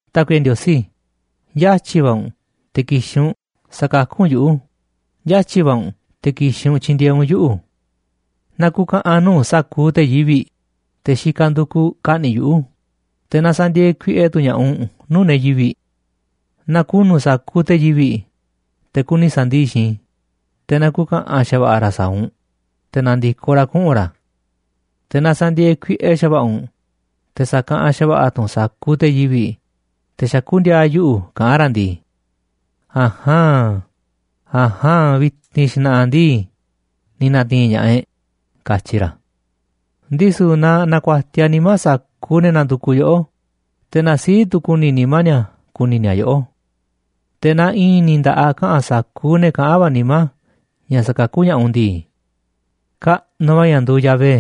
Tákuiꞌe Ndiosí, yatyi̱ va̱ u̱nꞌ te̱ ki̱xi̱n u̱nꞌ sa̱kakú u̱nꞌ yuꞌu̱, yatyi̱ va̱ u̱nꞌ te̱ ki̱xi̱n u̱nꞌ tyi̱ndi̱e̱eꞌ u̱nꞌ yuꞌu̱. Na ku̱ka̱ꞌa̱n nuu̱ꞌ sa̱kuuꞌ te̱ yivi̱ꞌ, te̱ xikaꞌ ndukuꞌ ka̱ꞌni̱ꞌ yuꞌu̱, te̱ na sa̱ndi̱e̱e̱ kuiꞌe tu̱ ña̱ꞌaꞌ u̱nꞌ nuu̱ꞌ ne̱ yivi̱ꞌ. Na ku̱nu̱ sa̱kuuꞌ te̱ yivi̱ꞌ, te̱ kuni sa̱ndii̱ꞌ xiinꞌ i̱, te̱ na ku̱ka̱ꞌa̱n xa̱va̱ꞌa̱ ra̱ sa̱a̱ u̱nꞌ, te̱ na̱ndi̱koꞌ ra̱ kuꞌu̱n ra̱. Te̱ na sa̱ndi̱e̱e̱ kuiꞌe xa̱va̱ꞌa̱ u̱nꞌ, te̱ sa̱kaꞌanꞌ xa̱va̱ꞌa̱ tu̱ u̱nꞌ sa̱kuuꞌ te̱ yivi̱ꞌ, te̱ xakú ndi̱a̱a̱ yuꞌu̱ kaꞌán ra̱ ndii: “A̱jaan, a̱jaan, vi̱ti̱n xna̱ꞌa̱ ndii, ni̱ na̱ti̱i̱n ña̱ꞌaꞌ e̱ꞌ”, katyi ra̱. Ndisu̱ na na̱ku̱a̱tiaꞌ nimá sa̱kuuꞌ ne̱ nandukuꞌ yoꞌó, te̱ na sii̱ꞌ tu̱ ku̱ni̱ nimá ni̱a̱ ku̱ni̱ ni̱a̱ yoꞌó. Te̱ na i̱i̱n ni̱ nda̱ꞌaꞌ kaꞌa̱n sa̱kuuꞌ ne̱ kaꞌán va̱ nimá ña̱ sa̱kakú ña̱ꞌaꞌ u̱nꞌ ndii: “Kaꞌnuꞌ va̱ ña̱ nduuꞌ Yahvé”,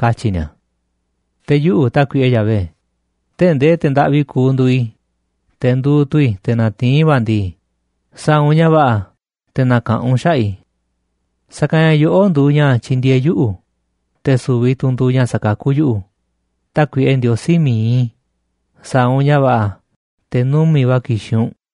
katyi̱ ni̱a̱. Te̱ yuꞌu̱, Tákuiꞌe Yahvé, tee̱ꞌ ndee te̱ ndaꞌvi kuuꞌ nduuꞌ i̱, te̱ nduuꞌ tu̱ i̱ te̱ natiín va̱ ndii, sa̱a̱ u̱nꞌ ña̱ va̱ꞌa̱ te̱ na̱ka̱ꞌanꞌ u̱nꞌ xaꞌa̱ꞌ i̱. Sa̱kanꞌ ña̱ yoꞌó nduuꞌ ña̱ tyindieeꞌ yuꞌu̱, te̱ su̱vi̱ tu̱ u̱nꞌ nduuꞌ ña̱ sakakú yuꞌu̱. Tákuiꞌe Ndiosí mi̱iꞌ i̱, sa̱a̱ u̱nꞌ ña̱ va̱ꞌa̱ te̱ numi̱ꞌ va̱ ki̱xi̱n u̱nꞌ.